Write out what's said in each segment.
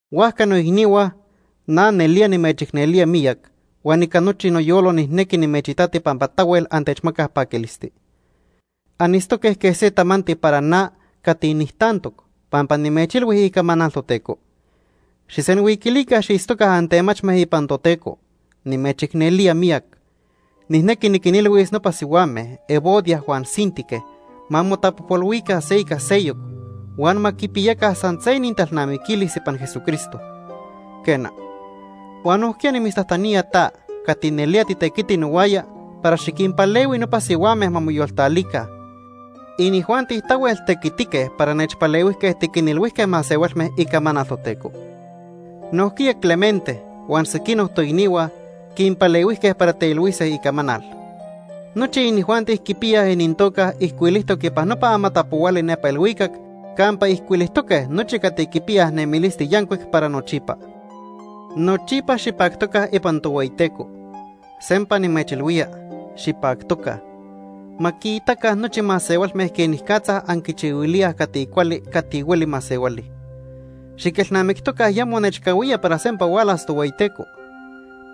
Huajca, noicnihua, na nelía nimechicnelía miyac huan ica nochi noyolo nijnequi nimechitati pampa tahuel antechmacaj paquilisti. Anitztoque quej se tamanti para na cati nijtantoc pampa nimechilhui icamanal Toteco. Xijsenhuiquilica xiitztoca antemachme ipan Toteco. Nimechicnelía miyac. Nijnequi niquinilhuis nopa sihuame Evodia huan Síntique ma motapojpolhuica se ica seyoc huan ma quipiyaca san se inintalnamiquilis ipan Jesucristo. Quena, huan nojquiya nimitztajtanía ta cati nelía titequiti nohuaya para xiquinpalehui nopa sihuame ma moyoltalica. Inijuanti tahuel tequititoque para nechpalehuijque tiquinilhuijque masehualme icamanal Toteco. Nojquiya Clemente huan sequinoc toicnihua quinpalehuijque para teilhuise icamanal. Nochi inijuanti quipiyaj inintoca ijcuilijtoc ipan nopa amatapohuali nepa ilhuicac campa ijcuilijtoque nochi cati quipiyaj nemilisti yancuic para nochipa. Nochipa xipactoca ipan Tohueyiteco. Sempa nimechilhuía, xipactoca. Ma quiitaca nochi masehualme quenicatza anquichihuilíaj cati cuali cati hueli masehuali. Xiquelnamictoca ya monechcahuía para sempa hualas Tohueyiteco.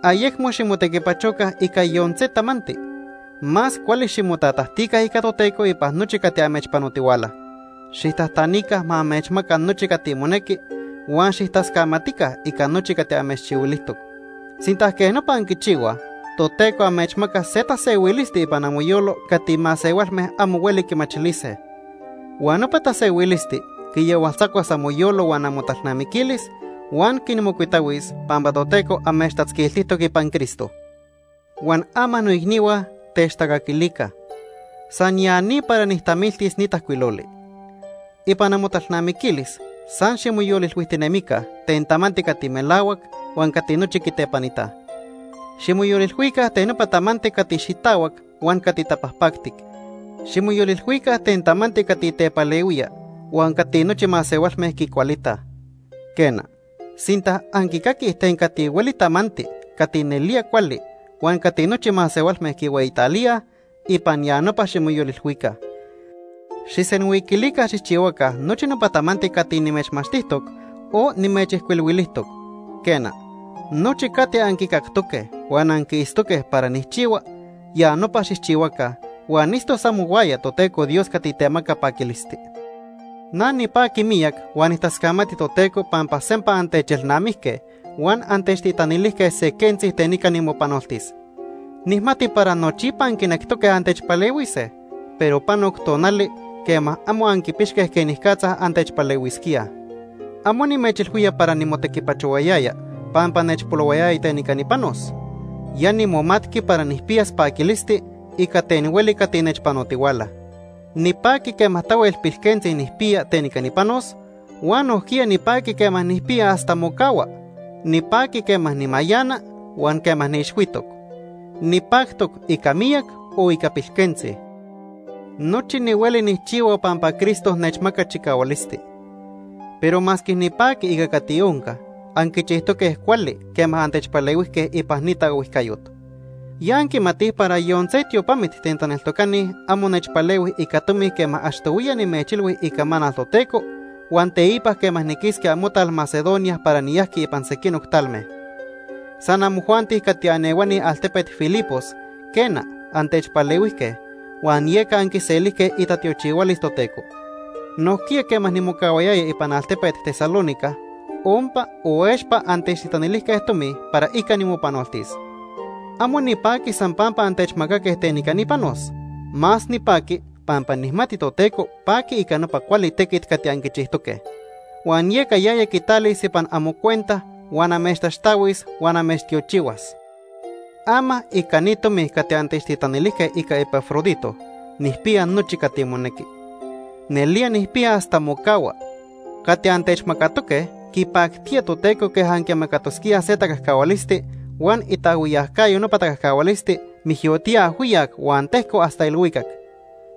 Ayecmo ximotequipachoca ica yon se tamanti. Más cuali ximotatajtica ica Toteco ipan nochi cati amechpanotihuala. Xijtajtanica ma amechmaca nochi cati monequi huan xijtascamatica ica nochi cati amechchihuilijtoc. Sinta quej nopa anquichihuaj, Toteco amechmacas se tasehuilisti ipan amoyolo cati masehualme amo hueli quimachilise. Huan nopa tasehuilisti quiyahualtzacuas amoyolo huan amotalnamiquilis huan quinmocuitahuis pampa Toteco amechtatzquiltijtoc ipan Cristo. Huan ama noicnihua, techtacaquilica. San ya ni para nijtamiltis ni tajcuiloli. Ipan amotalnamiquilis san ximoyolilhuijtinemica ten tamanti cati melahuac huan cati nochi quitepanitaj. Ximoyolilhuica ten nopa tamanti cati xitahuac huan cati tapajpactic. Ximoyolilhuica ten tamanti cati tepalehuía huan cati nochi masehualme quicualitaj. Quena, sinta anquicaquij ten cati hueli tamanti cati nelía cuali huan cati nochi masehualme quihueyitalíaj, ipan ya nopa ximoyolilhuica. Xijsenhuiquilica xijchihuaca nochi nopa tamanti cati nimechmachtijtoc o nimechijcuilhuilijtoc. Quena, nochi cati anquicactoque huan anquiitztoque para nijchihua, ya nopa xijchihuaca huan itztos amohuaya Toteco Dios cati temaca paquilisti. Na nipaqui miyac huan nijtascamati Toteco pampa sempa antechelnamijque huan antechtitanilijque se quentzi ten ica nimopanoltis. Nijmati para nochipa anquinectoque antechpalehuise, pero panoc tonali quema amo anquipixque quenicatza antechpalehuisquíaj. Amo nimechilhuía para nimotequipachohuayaya pampa nechpolohuayaya ten ica nipanos. Ya nimomatqui para nijpiyas paquilisti ica ten hueli cati nechpanotihuala. Nipaqui quema tahuel pilquentzi nijpiya ten ica nipanos huan nojquiya nipaqui quema nijpiya hasta mocahua. Nipaqui quema nimayana huan quema niixhuitoc. Nipactoc ica miyac o ica pilquentzi. Nochi nihueli nijchihua pampa Cristo nechmaca chicahualisti. Pero masque nipaqui ica cati onca, anquichijtoque cuali quema antechpalehuijque ipan ni taohuijcayot. Ya anquimatij para yon se tiopamit ten taneltocani amo nechpalehuij ica tomi quema achtohuiya nimechilhui icamanal Toteco huan teipa quema niquisqui amotal Macedonia para niyajqui ipan sequinoc talme. San amojuanti cati anehuani altepet Filipos, quena, antechpalehuijque, huan yeca anquiselijque itatiochihualis Toteco. Nojquiya quema nimocahuayaya ipan altepet Tesalónica, ompa o expa antechtitanilijque tomi para ica nimopanoltis. Amo nipaqui san pampa antechmacaque ten ica nipanos, más nipaqui pampa nijmati Toteco paqui ica nopa cuali tequit cati anquichijtoque. Huan yeca yaya quitalis ipan amocuenta huan amechtaxtahuis huan amechtiochihuas. Ama ica ni tomi cati antechtitanilijque ica Epafrodito, nijpiya nochi cati monequi. Nelía nijpiya hasta mocahua. Cati antechmacatoque quipactía Toteco quej anquimacatosquíaj se tacajcahualisti huan itaajhuiyacayo nopa tacajcahualisti mijyotía ajhuiyac huan tejco hasta ilhuicac.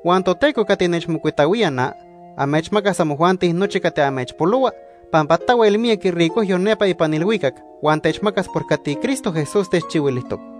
Huan Toteco cati nechmocuitahuía na, amechmacas amojuanti nochi cati amechpolohua pampa tahuel miyac iricojyo nepa ipan ilhuicac huan techmacas por cati Cristo Jesús techchihuilijtoc.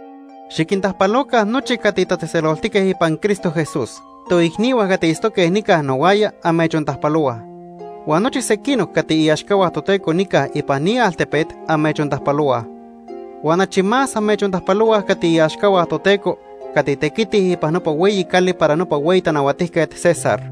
Xiquintajpaloca nochi cati tatzejtzeloltique ipan Cristo Jesús. Toicnihua cati itztoque nica nohuaya amechontajpalohuaj. Huan nochi sequinoc cati iaxcahua Toteco nica ipan ni altepet amechontajpalohuaj. Huan achi más amechontajpalohuaj cati iaxcahua Toteco cati tequitij ipan nopa hueyi cali para nopa hueyi tanahuatijquet, César.